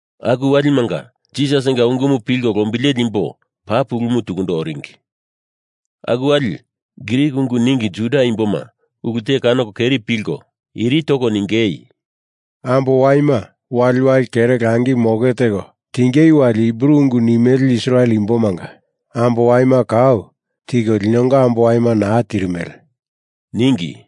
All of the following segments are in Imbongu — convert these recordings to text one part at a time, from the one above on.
Aku walimanga Jisasinga ungumu pilko lombileli imbo paa pulumu tukundo oringi. Aku wali Grik ungu ningi Juda imboma ulu te kanoko keri pilkolio iri toko ningei, “Ambo waima waliwali kere langi moke teko tingei wali Hibru ungu nimele Israel imbomanga ambo waima kau tiko linonga ambo waima naa tirimele,” ningi.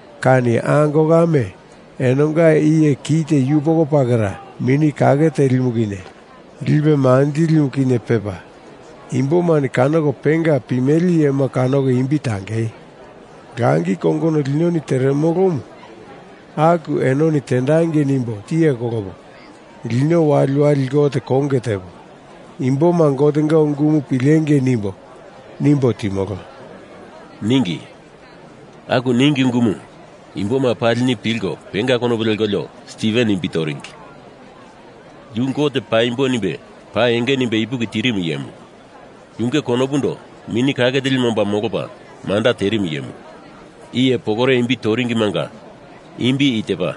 kani ango kame enonga iye kite yupoko pakera Mini Kake Telimu kinye lipe manjilimu kinye pepa imbomani kanoko penga pimele iyema kanoko imbi tangei. Langi kongono linoni teremolomu aku enoni tendangei nimbo tiye kolopo, lino waliwali Gote konge tepo imboma Gotenga ungumu pilengei nimbo, nimbo timolo,” ningi. Aku ningi ungumu imboma palini pilko penga konopu lekolio Stiven imbi toringi. Yu Gote paimbo nimbe paa enge nimbe ipuki tirimu iyemu. Yunge konopundo Mini Kake Telimu omba molopa manda terimu iyemu. Iye pokore imbi toringimanga imbi i tepa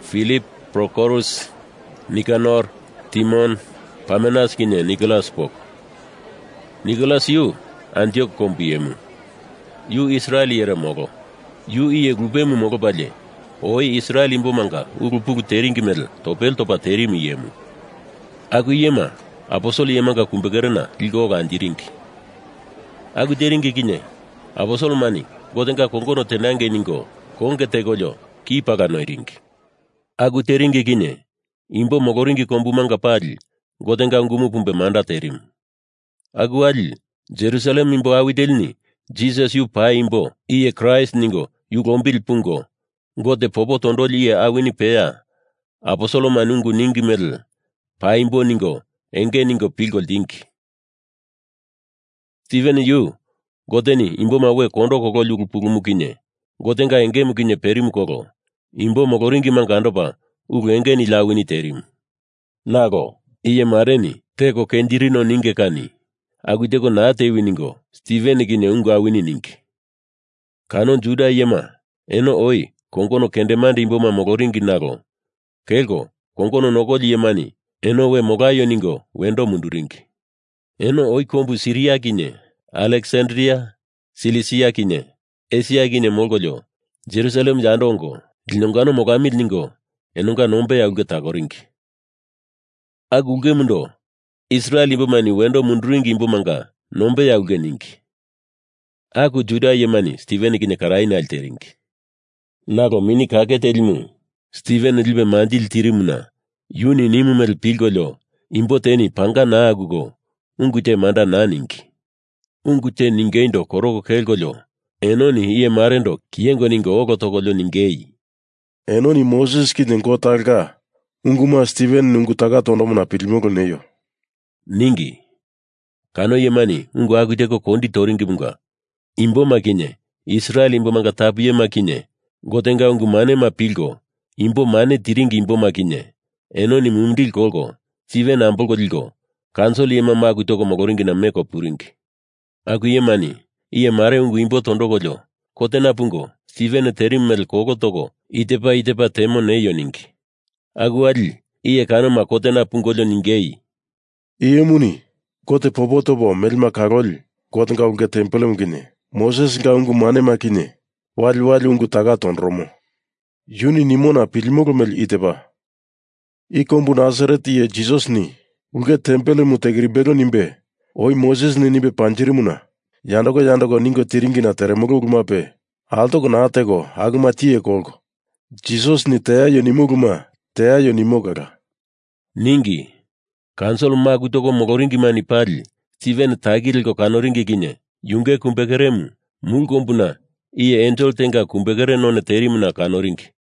Filip, Prokorus, Nikanor, Timon, Parmenas kinye Nikolas poko. Nikolas yu Antiok kombu iyemu, yu Israel iyere molo. Yu iye lupemu molopalie oi Israel imbomanga ulu pulu teringi mele topele topa terimu iyemu. Aku iyema aposel iyemanga kumbekerena liko ola anjiringi. Aku teringi kinye aposelemani Gotenga kongono tendangi ningo konge tekolio ki pala noiringi. Aku teringi kinye imbo moloringi kombumanga pali Gotenga ungumu pumbe manda terimu. Aku wali Jerusalem imbo awi telini Jisas yu paimbo iye Kraist ningo yu lombili pungo, Gote popo tondoli iye awini peya aposelemani ungu ningi mele paimbo ningo enge ningo pilko ltingi. Stiven yu Goteni imboma we kondo kololi ulu pulumu kinye Gotenga engemu kinye perimu kolo imbo moloringimanga andopa ulu enge nili awini terimu. Nalo iye mareni teko kenjirino ningo kani aku teko naa tewi ningo Stiven kinye ungu awini ningi. Kano Juda iyema eno oi kongono kendemande imboma moloringi nalo kelko kongono nokoli iyemani eno we molaio ningo wendo munduringi. Eno oi kombu Sairini kinye Aleksandria Silisia kinye Esia kinye molkolio Jerusalem yando ongo linongano molamili ningo enonga nombeya ulke takoringi. Aku ulkemundo Israel imbomani Wendo Munduringi Imbomanga Nombeya ulke ningi. Aku Juda iyemani Stiven kinye karaye nale teringi. Nalo Mini Kake Telimu Stiven lipe manjili tirimuna yuni nimu mele pilkolio imbo teni panga naa akuko ungu te manda naa ningi. Ungu te ningeindo koroko kelkolio enoni iye marendo kiyengo ningo olo tokolio ningei, “Enoni Moses kinye Gotenga talonga unguma Stiveneni ungu taka tondomona pilimolo neio,” ningi. Kano iyemani aku teko ungu kondi toringimunga imboma kinye Israel imbomanga tapu iyema kinye Gotenga ungu manema pilko imbo mane tiringi imboma kinye enoni mumindili kolko Stiven ambolko liko kaunsil iyema maku toko moloringina meko puringi. Aku iyemani iye mare ungu imbo tondokolio kotena pungo Stiven terimu mele kolo toko i tepa i tepa temo neio ningi. Aku wali iye kanoma kotena pungolio ningei, “Iye imuni Gote popo topo melema kaloli Gotenga ulke tempelemu kinye Mosesinga ungu manema kinye waliwali ungu taka tondoromo. Yuni nimona pilimolo mele i tepa, i kombu Nasaret iye Jisasini ulke tempelemu tekirimbelo nimbe oi Mosesini nimbe panjirimuna yandoko yandoko ningo tiringina teremolo ulumape altoko naa teko akuma tiye kolko Jisasini teaio nimo uluma teaio nimo kala,” ningi. Kaunsil maku toko moloringimani pali Stiven taki leko kanoringi kinye yunge kumbekeremu mulu kombuna iye ensel tenga kumbekere none terimuna kanoringi.